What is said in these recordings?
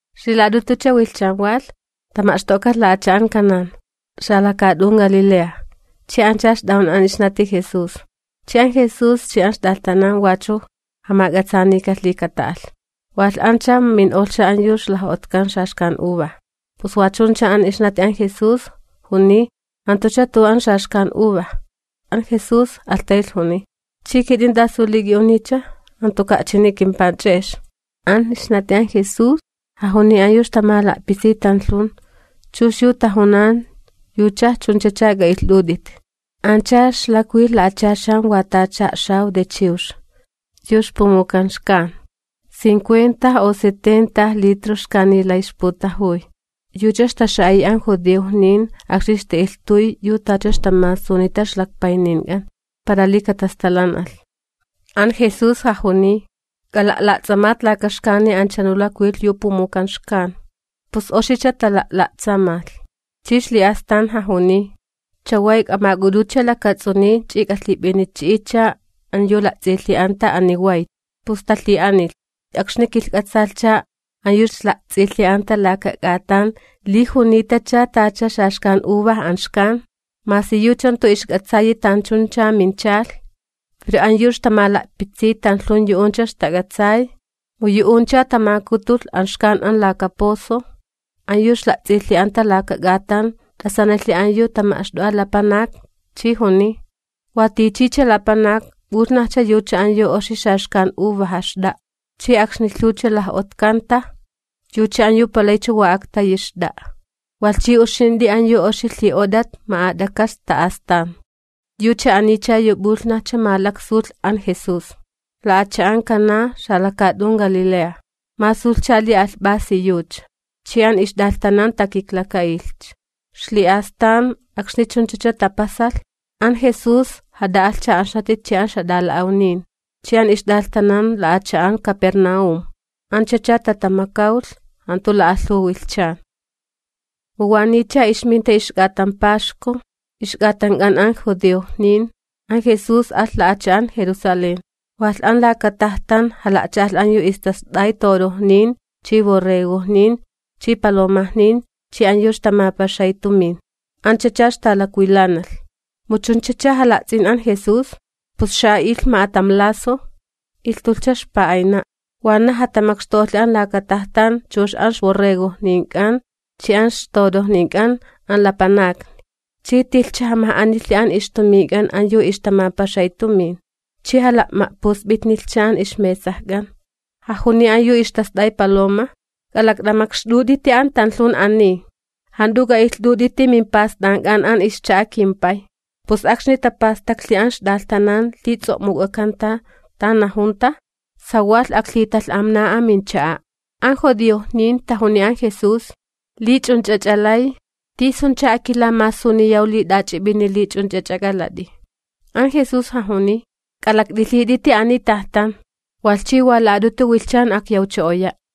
Ixlila'at'utucha wilhchan walh, tama'xto'kalh la'acha'an Caná, xalakaat'un Galilea, chi ancha ixt'ajun an ixnati Jesús. Chi an Jesús chi an ixt'alhtanan wachu jamak'atsaanikalhi li kata'alh. Walh ancha min'olhcha an yu ixlaj'otkan xaxkan uva. Pus wa chuncha an ixnati an Jesús, juniy: ―Jantucha tu'u an xaxkan uva. An Jesús alhtaylh juniy: ―¿Chi kit'in tasu li k'i'uniycha? Jantuka' chini kimpanch'e'ex. An ixnati an Jesús, jajuniy an yu ixtamala'pitsiy tanlhun: ―Chux yu tajunan yucha, yuch'ach'a k'a'ilht'ut'it. Ancha ixlakwilh la'achaxan wa tacha a'xaw de chiwx, yu ixpumujukan xkan, cincuenta u setenta litro xkani lay ixputajuy, yucha ixtaxa'a'iy an judiojnin akxni ixta'ilhtuy yu tacha ixtamasunita ixlakpaynink'an para li katastalan'alh. An Jesús jajuniy: ―K'ala'la'ts'amat laka xkani anchunu lakwilh yu pumujukan xkan. Pus oxicha tala'la'tsamalh. Chi ixli'astan jajuniy: ―Chaway k'amak'ut'utcha lakats'uniy chi k'alhip'inichi'itcha an yu la'ts'ilhi'anta ani wayt. Pus talhi'anilhcha. Kilhk'atsalhcha an yu ixla'ts'ilhi'anta laka k'atan li junitacha tacha xaxkan uva an xkan, masi yucha jantu ixk'atsayi tanchuncha minchalh. Pero an yu ixtamala'pitsiy tanlhun yu'uncha ixtak'atsay, mu yu'uncha tamakutulh an xkan an laka pozo. An yu ixla'ts'ilhi'anta laka k'atan t'asanilhi an yu tama'xt'o'a lapanak, chi juniy: ―Watichicha lapanak p'ulhnajcha yu an oxi xaxkan uvaja xt'a'a, chi akxni lhuwcha laj'otkanta, yucha an yu palaycha wa aktayi xt'a'a, walh chi uxint'i an yu oxi lhi'ot'at ma'at'aka sta astan. Yucha anicha yu p'ulhnajcha masulh an Jesús, la'acha'an Caná xalakaat'un Galilea, masulhcha li alhp'asi yucha, chi an ixt'alhtanan takiklaka'ilhcha. Ixli'astan akxni chunchacha tapasalh, an Jesús jat'a'alhcha an ixnati chi an ixjat'ala'awnin chi an ixt'alhtanan la'acha'an Capernaúm; anchacha tatamakawlh, jantu la'alhuw wilhchan. Mu waniycha ixminta ixk'atan paxku, ixk'atank'an an judiojnin, an Jesús alh la'acha'an Jerusalén. Walh an laka tajtan jala'cha'alh an yu ixtast'ay torojnin chi borregojnin chi palomajnin chi an yu ixtamapaxay tumin, anchacha ixtalakwilanalh. Mu chunchacha jala'ts'in an Jesús, pus xa'a'ilh ma'atam lazo, ilhtulhcha ixpa'ayna'na. Wanaj jatamakxtu'olhi an laka tajtan chux an ixborregojnink'an chi an ixtorojnink'an an lapanakni. Chi tilhcha jamaj'anilhi an ixtumink'an an yu ixtamapaxay tumin chi jala'ma'pusp'itnilhcha an ixmesajk'an. Jajuniy an yu ixtast'ay paloma: ―¡K'alakt'amakxt'ut'iti an tanlhun ani, jant'u k'a'ilht'ut'iti mimpast'ank'an an ixcha'a kimPay! Pus akxni tapastaklhicha an ixt'alhtanan li ts'o'muk'akanta, tan najunta: “¡Sawalh aklhitalh'amna an mincha'a'!” An judiojnin tajuniy an Jesús: ―Li ch'unch'ach'a lay, ¿tisuncha akilamasuniyaw li t'ach'ip'ini li ch'unch'ach'a k'alat'i? An Jesús jajuniy: ―K'alakt'ilhit'iti ani tajtan, walh chi wa la'at'utu wilhchan akyawcho'oya'.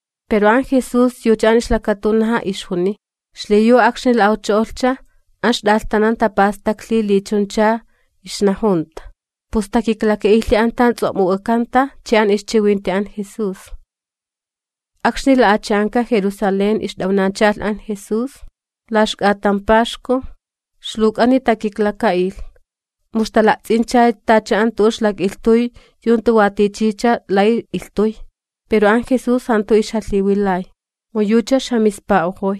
Pero an Jesús yucha an ixlakatunaja ixjuniy. Xliyu akxni la'awcho'olhcha, an ixt'alhtanan tapastaklhi li chuncha ixnajunta, pus takiklaka'ilhi an tan ts'o'muk'akanta chi an ixchiwinti an Jesús. Akxni la'acha'anka Jerusalén ixt'awnachalh an Jesús, la ixk'atan Paxku, ixluwk'ani takiklaka'ilh, mu ixtala'ts'incha tacha an tu'u ixlak'ilhtuy yu jantu wa tichicha lay ilhtuy. Pero an Jesús jantu ixjalhiwilay, mu yucha ixjamispa'ojoy.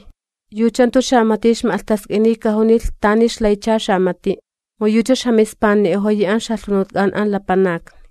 Yucha jantu xamati ixma'lhtask'iniy kajunilh tani ixlaycha xamati'. Mu yucha ixjamispani'ojoyi an ixjalhunutk'an an lapanakni.